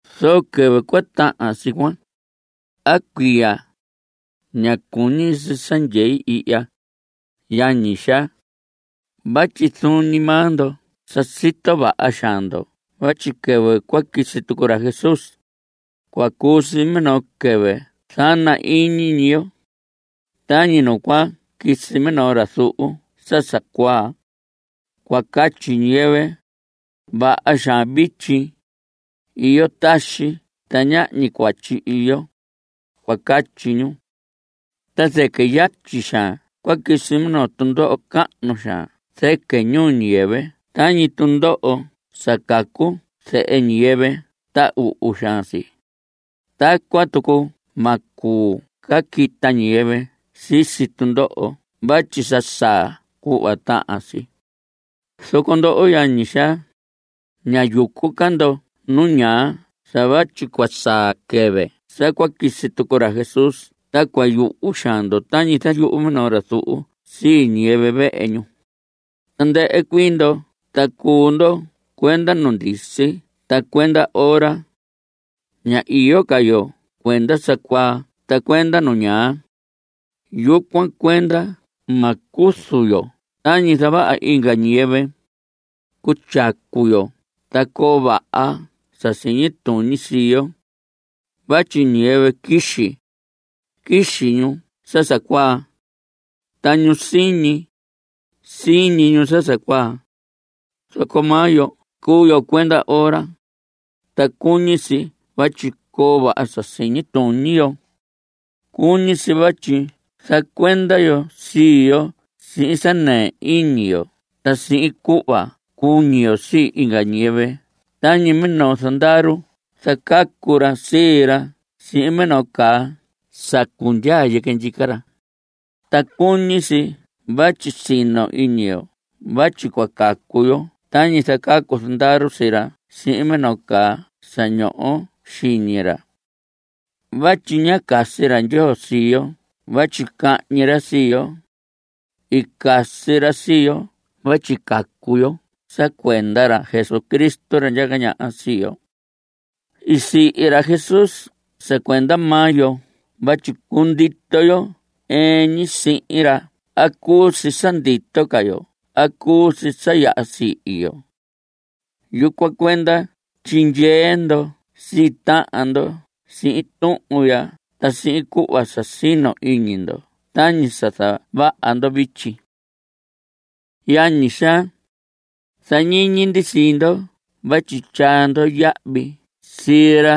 Zoco quɨvɨ cua tahan si cuan, a cuiya, ña cuñi si sa tyei ihya, yañi xaa. Vatyi zuun ñi maa ndo sa sito vaha xaan ndo vatyi quɨvɨ cua quisi tucu ra Jesús, cua cuu si minoo quɨvɨ zana ñi iñi yo. Tañi nu cua quisi minoo ra zuhu sa sa cuaa. Cua catyi ñiyɨvɨ: “Vaha xaan vityi. Iyo taxi, ta ñahñi cuatyi iyo”, cua catyi ñu. Ta zɨquɨ yatyi xaan cua quisi minoo tundoho cahnu xaan zɨquɨ ñiyɨvɨ tañi tundoho sa cacu zehe ñiyɨvɨ ta uhu xaan si. Tacuan tucu ma cuu ca quita ñiyɨvɨ sisi tundoho vatyi sa saa cuhva tahan si. Zoco ndoho, yañi xaa, ña yucu ca ndo nu ñaa sa vatyi cua saa quɨvɨ sa cua quisi tucu ra Jesús ta cua yuhu xaan ndo tañi zayuhu minoo ra zuhu sii ñiyɨvɨ vehe ñu. Tandɨhɨ cuii ndo ta cuu ndo cuenda nu ndisi ta cuenda ora. Ña iyo ca yo cuenda sa cuaa ta cuenda nu ñaa. Yucuan cuenda ma cuzu yo tañi zavaha inga ñiyɨvɨ. Cutyacu yo ta coo vaha sa siñi tuñi sii yo. Vatyi ñiyɨvɨ quixi, quixi ñu sa cuaa. Ta ñu siñi, siñi ñu sa cuaa. Zoco maa yo cuu yo cuenda ora, ta cuñi si vatyi coo vaha sa siñi tuñi xiñi yo. Cuñi si vatyi zacuenda yo sii yo sihin sa nɨɨ iñi yo ta sihin cuhva cuñi yo sii inga ñiyɨvɨ tañi minoo zandaru zacacu ra sii ra sihin minoo caa sa cundyaa yɨquɨ ndyica ra. Ta cuñi si vatyi sino iñi yo vatyi cua cacu yo tañi zacacu zandaru sii ra sihin minoo caa sa ñoho xiñi ra. Vatyi ñá casi ra Ndyoo sii yo vatyi cañi ra sii yo. I casi ra sii yo vatyi cacu yo sa cuenda ra Jesucristo, ra ndyaca ñaha sii yo. I sihi ra Jesús sa cuenda maa yo vatyi cundito yo ɨɨn ñi sihin ra a cuu si sa ndito ca yo a cuu si sa yaha sihi yo. Yucuan cuenda tyindyee ndo sii tahan ndo sihin tuhun ya ta sihin cuhva sa sino iñi ndo tañi sa zavaha ndo vityi. Yañi xaa, zañiñi ndi sii ndo vatyi tyaa ndo yahvi sii ra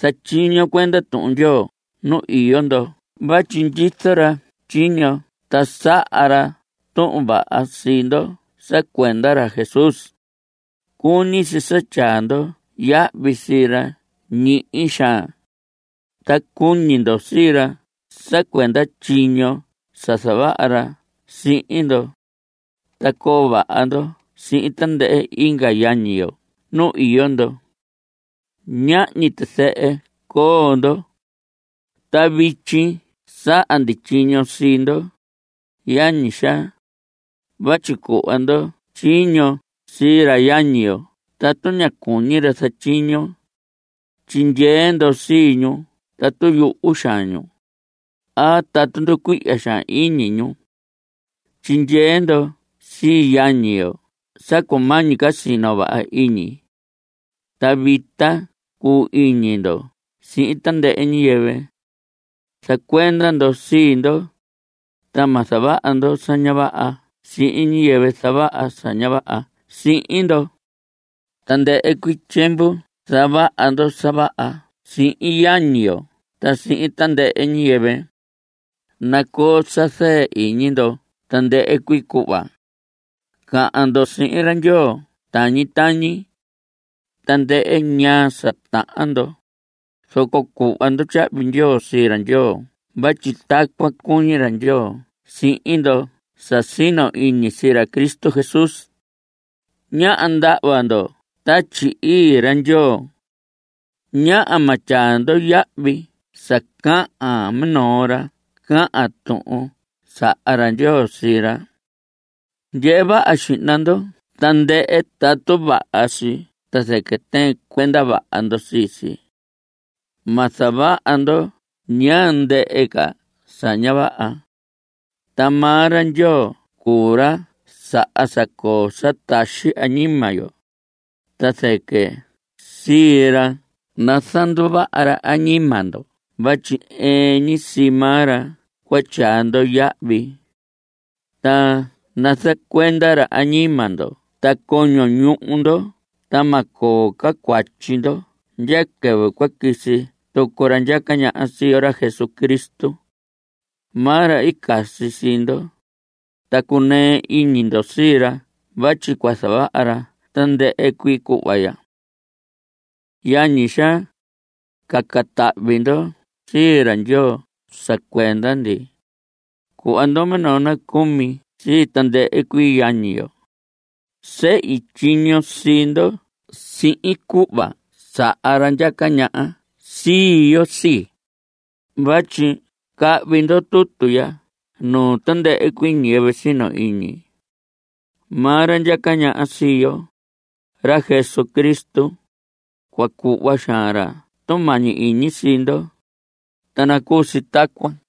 zatyiño cuenda Tuhun Ndyoo nu iyo ndo vatyi ndyizo ra tyiño ta saha ra tuhun vaha sii ndo sa cuenda ra Jesús. Cuñi si sa tyaa ndo yahvi sii ra ñihi xaan, ta cuñi ndo sii ra sa cuenda tyiño sa zavaha ra sihin ndo. Ta coo vaha ndo sihin tandɨhɨ inga yañi ndo nu iyo ndo. Ñahñi tizɨhɨ coo ndo. Ta vityi saha ndi tyiño sii ndo, yañi xaa, vatyi cuhva ndo tyiño sii ra yañi yo tatu ña cuñi ra zatyiño. Tyindyee ndo sii ñu tatu yuhu xaan ñu, a tatu nducuihya xaan iñi ñu. Tyindyee ndo sii yañi yo sa cumañi ca sino vaha iñi. Ta vita cuu iñi ndo sihin tandɨhɨ ñiyɨvɨ. Zacuenda ndo sii ndo, ta ma zavaha ndo sa ña vaha sihin ñiyɨvɨ zavaha sa ña vaha sihin ndo. Tandɨhɨ cuii tyiemvu zavaha ndo sa vaha sihin yañi yo ta sihin tandɨhɨ ñiyɨvɨ. Nacoo sa zɨɨ iñi ndo tandɨhɨ cuii cuhva. Cahan ndo sihin ra Ndyoo tañi tañi. Tandɨhɨ ñaa sa tahan ndo, zoco cuhva ndo tyahvi ndyoo sii ra Ndyoo vatyi tacuan cuñi ra Ndyoo sihin ndo sa sino iñi sii ra Cristo Jesús. Ñáha ndahva ndo Tatyi Ii ra Ndyoo. Ñáha ma tyaa ndo yahvi sa cahan minoo ra cahan tuhun sa saha ra Ndyoo sii ra. Ndyehe vaha xihna ndo tandɨhɨ tatu vaha si ta zɨquɨ tɨɨn cuenda vaha ndo sii si. Ma zavaha ndo ñaa ndɨhɨ ca sa ña vaha. Ta maa ra Ndyoo cuu ra saha sa coo taxi añima yo, ta sique sii ra nazanduvaha ra añima ndo vatyi ɨɨn ñi sii maa ra cua tyaa ndo yahvi. Ta nazacuenda ra añima ndo ta coño ñuhu ndo ta ma coo ca cuatyi ndo ndya quɨvɨ cua quisi tucu ra ndyaca ñaha sii yo, ra Jesucristo. Maa ra i casi sii ndo, ta cuu cunɨɨ iñi yo sii ra vatyi cua zavaha ra tandɨhɨ cuii cuhva ya. Yañi xaa, caca tahvi ndo sii ra Ndyoo sa cuenda ndi. Cuhva ndo minoo nacumi sii tandɨhɨ cuii yañi yo. Sehi tyiño sii ndo sihin cuhva saha ra ndyaca ñaha sii yo sii, vatyi cahvi ndo tutu ya nuu tandɨhɨ cuii ñiyɨvɨ sino iñi. Maa ra ndyaca ñaha sii yo, ra Jesucristo, cua cuhva xaan ra tumañi iñi sii ndo. Ta nacuu si tacuan.